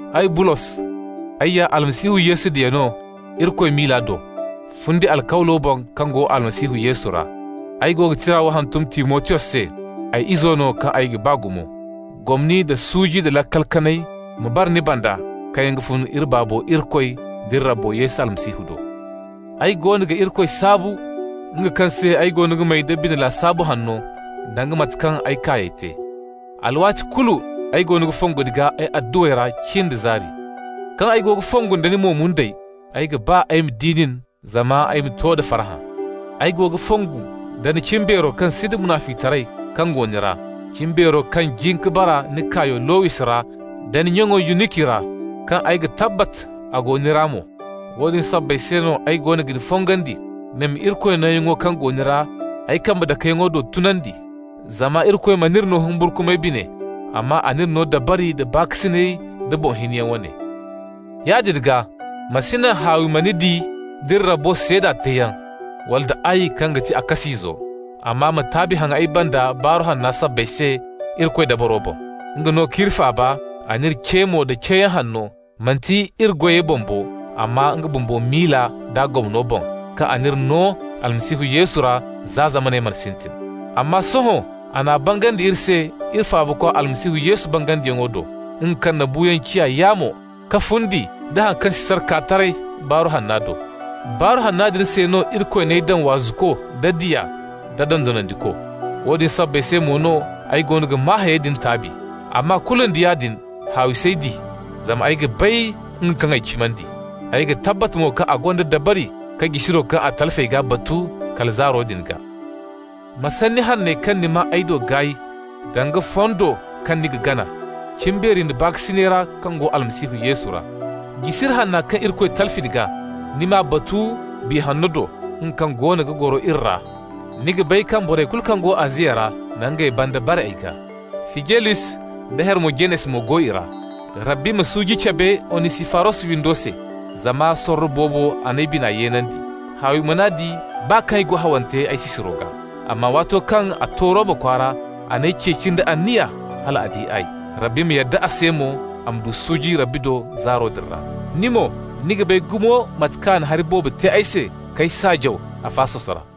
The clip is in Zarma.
Ay Bulos, ay ya Almasihu Yesu diya no Irikoy miila do, fundi alkawlo boŋ kaŋ go Almasihu Yesu ra. Ay go ga tira wo hantum Timotiyos se, ay izo no kaŋ ay ga ba gumo. Gomni nda suuji nda laakal kanay ma bara ni banda kaŋ yaŋ ga fun iri Baabo Irikoy d'iri Rabbo Yesu Almasihu do. Ay goono ga Irikoy saabu, nga kaŋ se ay goono ga may da bine lasaabu hanno danga mate kaŋ ay kaayey te. Alwaati kulu ay goono ga fongu ni gaa ay adduwey ra cin da zaari. Kaŋ ay go ga fongu nda ni mo-mundey, ay ga ba ay ma di nin zama ay ma to da farhã. Ay go ga fongu nda cimbeero kaŋ sinda munaficitaray kaŋ go ni ra, cimbeero kaŋ jin ka bara ni kaayo Lowis ra da ni nyaŋo Yuniki ra, kaŋ ay ga tabbat a go ni ra mo. Woodin sabbay se no ay goono ga ni fongandi ni ma Irikoy nooyaŋo kaŋ go ni ra ay kambe dakeyaŋo do tunandi. Zama Irikoy mana iri no humburkumay bine, amma a n'iri no dabari nda baakasinay da boŋ hinyaŋ wane. Yaadin gaa, ma si naŋ haawi ma ni di d'iri Rabbo seeda teeyaŋ, wala nda ay kaŋ ga ti a kas'izo. Amma ma taabi haŋ ay banda Baaru Hanno sabbay se Irikoy dabaro boŋ. Nga no k'iri faaba, a n'iri ce mo da ceeyaŋ hanno, manti iri goyey boŋ bo, amma nga bumbo miila d'a gomno boŋ, kaŋ a n'iri no Almasihu Yesu ra za zamaney mana sintin. Amma sohõ a n'a bangandi iri se iri Faabakwa Almasihu Yesu bangandiyaŋo do, nga kaŋ na buuyaŋ ciya yaamo, ka fundi nda haŋ kaŋ si sara kaa taray Baaru Hanna do. Baaru Hanna din se no Irikoy n'ay daŋ waazuko da diya da dondonandiko. Woodin sabbay se mo no ay goono ga maa hayey din taabi. Amma kulu nda yaadin haawi s'ay di, zama ay ga bay nga kaŋ ay cimandi. Ay ga tabbat mo kaŋ a gonda dabari ka jisiro kaŋ ay talfi a gaa batu kala zaaro din gaa. Ma sanni hanney kaŋ ni maa ay do gaay, danga fondo kaŋ ni ga gana, cimbeeri nda baakasinay ra kaŋ go Almasihu Yesu ra. Jisiri hanna kaŋ Irikoy talfi ni gaa, ni m'a batu Biya Hanno do, nga kaŋ goono ga goro iri ra. Ni ga bay kaŋ borey kulu kaŋ go Aziya ra na ngey banda bare ay gaa. Fijelus da Hermojenes mo go i ra. Rabbi ma suuji cabe Onisifaros windo se, zama sorro boobo a n'ay bina yeenandi. Haawi man'a di baa kaŋ ay go hawante ay sisiro gaa, amma waato kaŋ a to Roma kwaara a n'ay ceeci nda anniya hal a di ay. Rabbi ma yadda a se mo, a ma du suuji Rabbi do zaaro din ra. Ni mo, ni ga bay gumo mate kaŋ a na hari boobo te ay se k'ay saajaw Afasos ra.